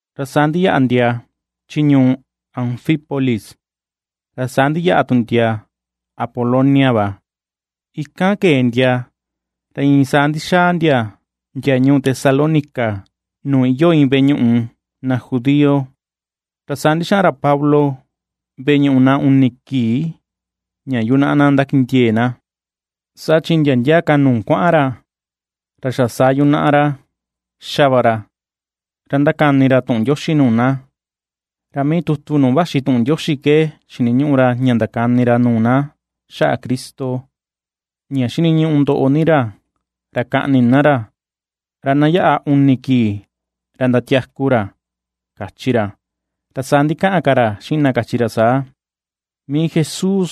Ra saa ndiyaꞌa ndia chi ñuu Anfípolis, ra saa ndiyaꞌa tu ndia Apolonia va, ikan kee ndia ra iin saa ndixaa ndia ndia ñuu Tesalónica nuu iyoo iin veꞌe ñuꞌu na judío. Ra saa ndixaꞌan ra Pablo veꞌe ñuꞌu na uni kii ña yunaꞌa na ndakindiee na, saa chi ndia ndia ka nuu kuaꞌan ra, ra xa saa yunaꞌa ra ^xa va ra, ra ndakani ra tuꞌun Ndioxi nuu na. Ra mii tutu nuu vaxi tuꞌun Ndioxi ke xiniñuꞌu ra ña ndakani ra nuu na xaꞌa Cristo, ña xiniñuꞌu ndoꞌo ni ra, ra kaꞌni na ra, ra na yaꞌa uni kii ra ndatiaku ra, kachi ra. Ra saa ndikaꞌan ka ra xiꞌin na, kachi ra saa: ―Mii Jesús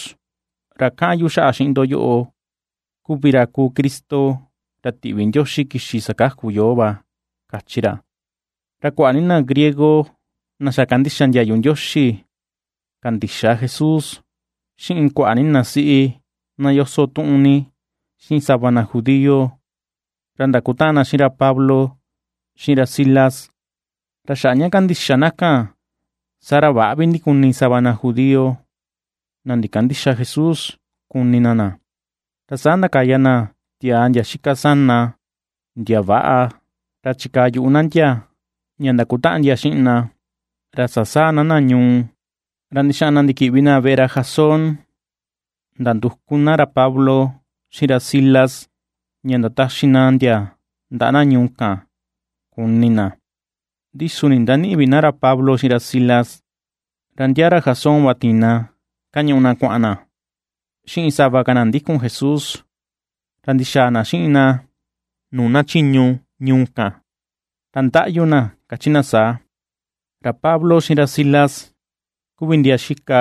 ra kaꞌan yu xaꞌa xiꞌin ndo yoꞌo, kuvi ra kuu Cristo ra tiꞌvi Ndioxi kixi sakaku yoo va ―kachi ra. Ra kuaꞌa ni na griego na xa kandixa ndiayu Ndioxi kandixa Jesús, xiꞌin kuaꞌa ni na siꞌi na yoso tuꞌun ni, xiꞌin sava na judío, ra ndakutaꞌan na xiꞌin ra Pablo xiꞌin ra Silas. Ra xaꞌa ña kandixa na kan, saa ra väꞌa ndikuni sava na judío, na ndikandïxa Jesús kuni na na, ra saa ndakaya na tiaa ndia xika sana, ndia väꞌa, ra chikaa yuꞌu na ndia ña ndakutaꞌan ndia xiꞌin na, ra sasaa na na ñuu, ra ndixaꞌan na ndikiꞌvi na veꞌe ra Jasón ndanduku na ra Pablo, xiꞌin ra Silas ña ndataxi na ndia ndaꞌa na ñuu kan kuni na. Ndi su ndindanïꞌi vi na ra Pablo xiꞌin ra Silas, ra ndia ra Jasón va tiin kañuꞌu na kuaꞌan na, xiꞌin sava ka na ndikun Jesús, ra ndixaa na xiꞌin na nuu na chiñu ñuu kan, ra ndaꞌyu na, kachi na saa: ―Ra Pablo xiꞌin ra Silas, kuvi ndia xika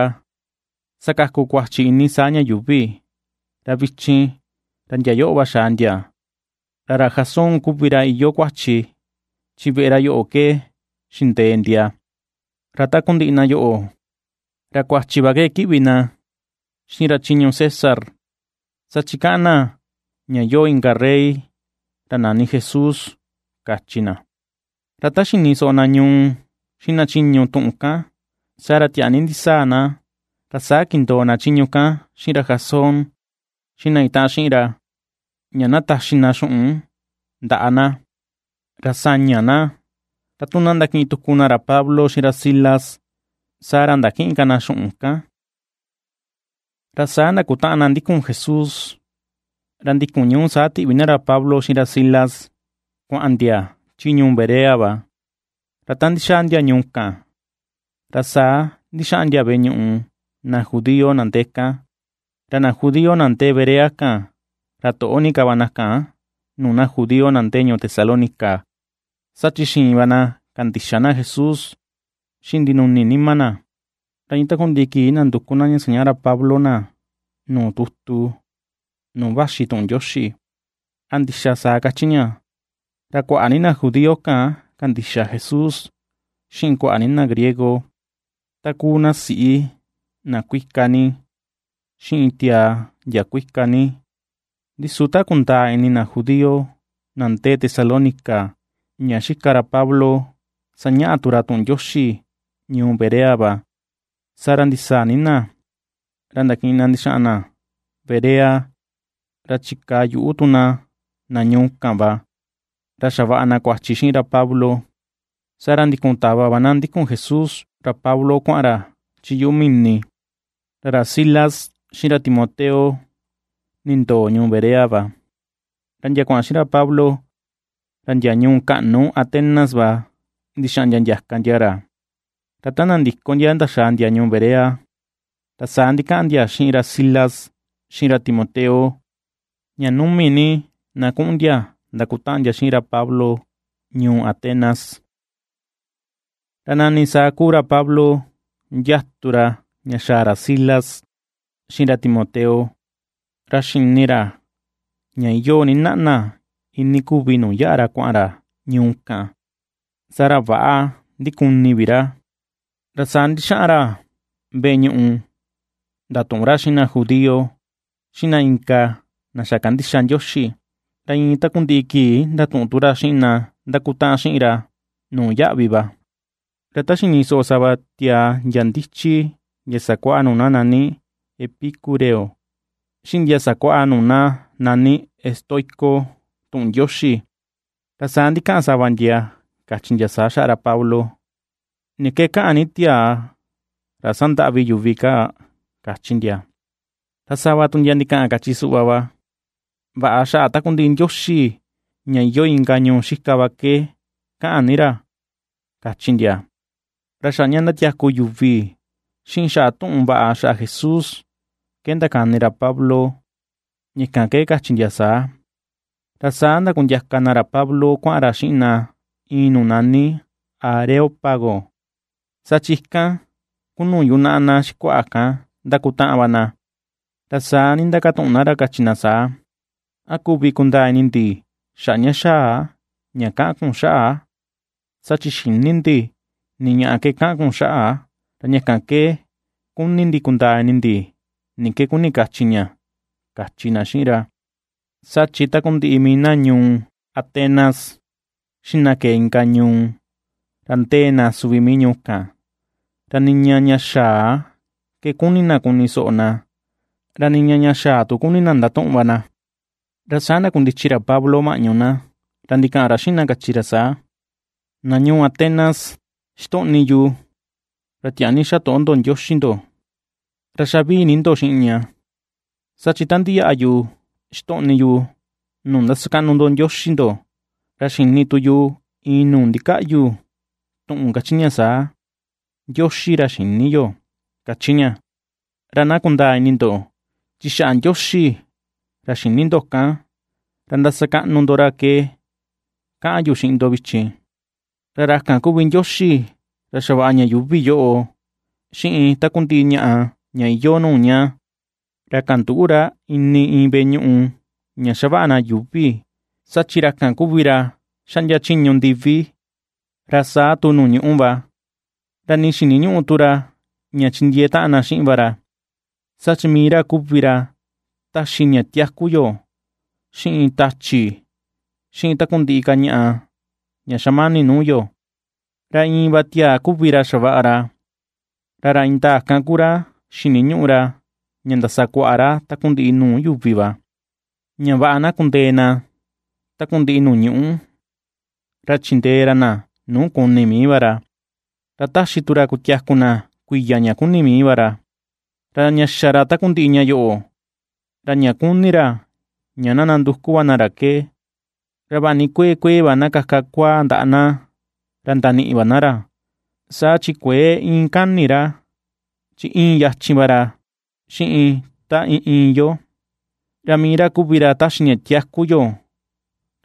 sakaku kuachi ini saa ña yuuvi, ra vichin ra ndia yoꞌo va xaa ndia, Ra ra Jasón kuvi ra iyoo kuachi, chi veꞌe ra yoꞌo ke xindee ndia. Ra takundiꞌi na yoꞌo, ra kuachi va ke kiꞌvi na xiꞌin ra chiñu César, saa chi kaꞌan na ña yoo inka rey, ra nani Jesús ―kachi na. Ra ta xini soꞌo na ñuu xiꞌin na chiñu tuꞌun kan, saa ra tiaa ni ndisaa na. Ra saa kindoo na chiñu kan xiꞌin ra Jasón xiꞌin na itaꞌan xiꞌin ra, ña na taxi na xuꞌun ndaꞌa na, ra saña na, ra tu na ndakiꞌin tuku na ra Pablo xiꞌin ra Silas saa ra ndakïꞌin ka na xuꞌun kan. Ra saa ndakutaꞌan na ndikun Jesús, ra ndikun ñuu saa tiꞌvi na ra Pablo xiꞌin ra Silas kuaꞌan ndia chi ñuu Berea va. Ra ta ndixaa ndia ñuu kan, ra saa ndixaꞌan ndia veꞌe ñuꞌu na judío na ndee kan. Ra na judío na ndee Berea kan, ra toꞌo ni ka va na kan nuu na judío na ndee ñuu Tesalónica, saa chi xiin va na kandixa na Jesús xiꞌin ndinuni nima na, ra iin takundiꞌi kii nanduku na ña sañaꞌa ra Pablo na nuu tutu nuu vaxi tuꞌun Ndioxi, a ndixa saa kachi ña. Ra kuaꞌa ni na judío kan kandixa Jesús, xiꞌin kuaꞌa ni na griego, ta kuu na siꞌi na kuika ni, xiꞌin tiaa ndia kuika ni. Ndi su ta kundaa ini na judío na ndee Tesalónica ña xika ra Pablo sañaꞌa tu ra tuꞌun Ndioxi ñuu Berea va, saa ra ndisaa ni na, ra ndakiꞌin na ndixaa na Berea ra chikaa yuꞌu tu na, na ñuu kan va ra xavaꞌa na kuachi xiꞌin ra Pablo. Saa ra ndikun tava va na ndikun Jesús ra Pablo kuaꞌan ra chi yuꞌu mini, ra ra Silas xiꞌin ra Timoteo nindoo ñuu Berea va. Ra ndia kuaꞌan xiꞌin ra Pablo ra ndia ñuu kaꞌnu Atenas va ndixaꞌan ndia ndiaka ndia ra. Ra ta nandiko ndia ndaxaa ndia ñuu Berea, ra saa ndikaꞌan ndia xiꞌin ra Silas xiꞌin ra Timoteo, ña numi ni na kuꞌun ndia ndakutaꞌan ndia xiꞌin ra Pablo ñuu Atenas. Ra nani saa kuu ra Pablo ndiatu ra ña xaa ra Silas xiꞌin ra Timoteo, ra xini ra ña iyoo ni naꞌna iinii kuvi nuu yaꞌa kuaꞌan ra ñuu kan, saa ra väꞌa ndikuni vi ra. Ra saa ndixaꞌan ra veꞌe ñuꞌu ndatuꞌun ra xiꞌin na judío, xiꞌin na inka na xa kandixa Ndioxi, ra iin takundiꞌi kii ndatuꞌun tu ra xiꞌin na ndakutaꞌan ra xiꞌin nuu yaꞌvi va. Ra ta xini soꞌo sava tiaa ndia ndichi ndia sakuaꞌa nuu na nani epicúreo, xiꞌin ndia sakuaꞌa nuu na nani estoico, tuꞌun Ndioxi, ra saa ndikaꞌan sava ndia, kachi ndia saa xaꞌa ra Pablo: ―¿Ni ke kaꞌan ni tiaa ra sandaꞌvi yuvi kaa? ―kachi ndia. Ra sava tu ndia ndikaꞌan, kachi suꞌva va: ―¿Vaꞌa xaꞌa takundiꞌi ndioxi ña iyoo inka ñuu xika va ke kaꞌan ni ra? ―kachi ndia. Ra xaꞌa ña ndatiaku yuvi, xiꞌin xaꞌa tuꞌun vaꞌa xaꞌa Jesús ke ndakani ra Pablo, ña kan ke kachi ndia saa. Ra saa ndakundiaka na ra Pablo kuaꞌan ra xiꞌin na iin nuu nani Areópago, saa chi ikan kuu nuu yunaꞌa na xikuaꞌa kan ndakutaꞌan va na, ra saa ndindakatuꞌun na ra, kachi na saa: ―¿A kuvi kundaa ini ndi xaꞌa ña xaa ña kaꞌan kun xaꞌa? Saa chi xïni ndi ni ñaꞌa ke kaꞌan kun xaꞌa, ra ña kan ke kuni ndi kundaa ini ndi ni ke kuni kachi ña ―kachi na xiꞌin ra. Saa chi takundiꞌi mii na ñuu Atenas xiꞌin na kee inka ñuu ra ndee na suvi ñuu kan, ra niña ña xaa ke kuni na kuni soꞌo na, ra niña ña xaa tu kuni na ndatuꞌun va na. Ra saa ndakundichi ra Pablo maꞌñu na, ra ndikaꞌan ra xiꞌin na, kachi ra saa: ―Ndoꞌo, na ñuu Atenas, xitoꞌni yu ra tiaa ni xatoꞌo ndioxi ndo, ra xa vii ni ndo xiꞌin ña. Saa chi ta ndiyaꞌa yu xitoꞌni yu nuu ndasakaꞌnu ndo ndioxi ndo, ra xini tu yu iin nuu ndikaꞌyu tuꞌun kachi ña saa: “NDIOXI RA XÏNI YO”, kachi ña. Ra na kundaa ini ndo, chi xaꞌa Ndioxi ra xïni ndo kan ra ndasakaꞌnu ndo ra ke kaꞌan yu xiꞌin ndo vichin. ’Ra ra kan kuvi Ndioxi ra xavaꞌa ña yuuvi yoꞌo, xiꞌin takundiꞌi ñaꞌa ña iyoo nuu ña. Ra kandüꞌu ra ini iin veꞌe ñuꞌu ña xavaꞌa na yuuvi, saa chi ra kan kuvi ra xaꞌndia chiñu ndivi, ra saa tu nuu ñuꞌu va. Ra nii xiniñüꞌu tu ra ña chindiee taꞌan na xiꞌin va ra, saa chi mii ra kuvi ra taxi ña tiaku yo, xiꞌin tachi, xiꞌin takundiꞌi ka ñaꞌa ña xamani nuu yo. ’Ra iin va tiaa kuvi ra xavaꞌa ra, ra ra indaa kan ku ra xiniñuꞌu ra ña ndasa kuaꞌa ra takundiꞌi nuu yuvi va, ña vaꞌa na kundee na takundiꞌi nuu ñuꞌu, ra chindee ra na nuu kuni mii va ra, ra taxi tu ra kutiaku na kuiya ña kuni mii va ra. Ra ña xa ra takundiꞌi ña yoꞌo, ra ña kuni ra ña na nanduku va na ra ke, ra vaꞌa ni kuee kuee va na kaka kuaa ndaꞌa na, ra ndaniꞌi va na ra, saa chi kuëe iin kani ra, chi íin yachin va ra xiꞌin ta iin iin yo. Ra mii ra kuvi ra taxi ña tiaku yo,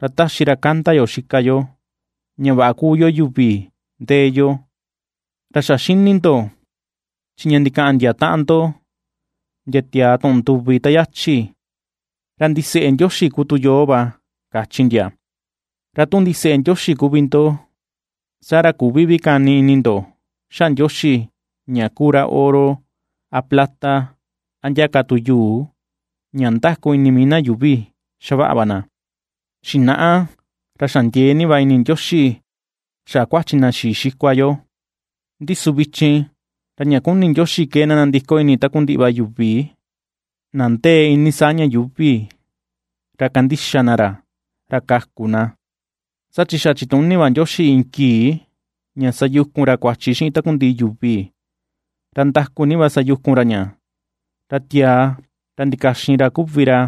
ra taxi ra kanda yo xika yo, ña vaꞌa kuu yo yuvi ndee yo. Ra xa xini ndo chi ña ndikaꞌan ndia taꞌan ndo ndia tiaa tuꞌun nduvi ta yachi ra “Ndiseꞌe Ndioxi kuu tu yoo va”, kachi ndia. Ra tu ndiseꞌe Ndioxi kuvi ndo, saa ra küvi vi kani ini ndo xaꞌa Ndioxi ña kuu ra oro, a plata a ndia ka tu yuu ña ndaku ini mii na yuuvi xavaꞌa va na. Xinaꞌa ra xa ndiee ni va ini Ndioxi xaꞌa kuachi na xii xikua yo. Ndi su vichin ra ña kuni Ndioxi ke na nandiko ini takundiꞌi va yuvi na ndee iinii saa ña yuuvi ra kandixa na ra, ra kaku na. Saa chi xa chituni va Ndioxi iin kii ña sayukun ra kuachi xiꞌin takundiꞌi yuvi, ra ndaku ni va sayukun ra ña, ra tiaa ra ndikaxin ra kuvi ra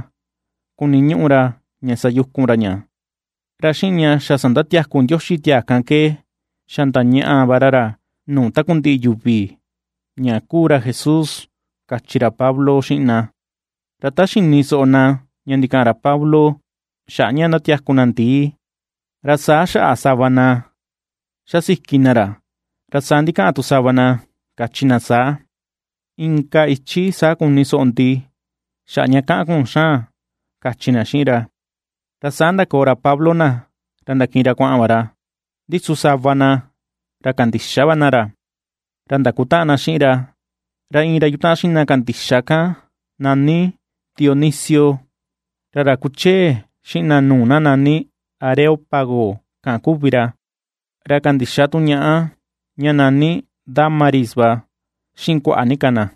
kuniñuꞌu ra ña sayukun ra ña. Ra xiꞌin ña xa sandatiaku Ndioxi tiaa kan ke xa ndañaꞌa va ra ra nuu takundiꞌi yuvi, ña kuu ra Jesús ―kachi ra Pablo xiꞌin na. Ra ta xini soꞌo na ña ndikaꞌan ra Pablo xaꞌa ña ndatiaku na ndii, ra saa xaꞌa sava na xasiki na ra, ra saa ndikaꞌan tu sava na, kachi na saa: ―Inka ichi saa kuni soꞌo ndi xaꞌa ña kaꞌan kun xaan ―kachi na xiꞌin ra. Ra saa ndakoo ra Pablo na, ra ndakiꞌin ra kuaꞌan va ra. Ndi su sava na, ra kandixa va na ra, ra ndakutaꞌan na xiꞌin ra. Ra iin ra yutaꞌan xiꞌin na kandixa kan nani Dionisio, ra ra kuchee xiꞌin na nuu nani Areópago kan kuvi ra, ra kandixa tu ñaꞌa ña nani Dámaris va, xiꞌin kuaꞌa ni ka na.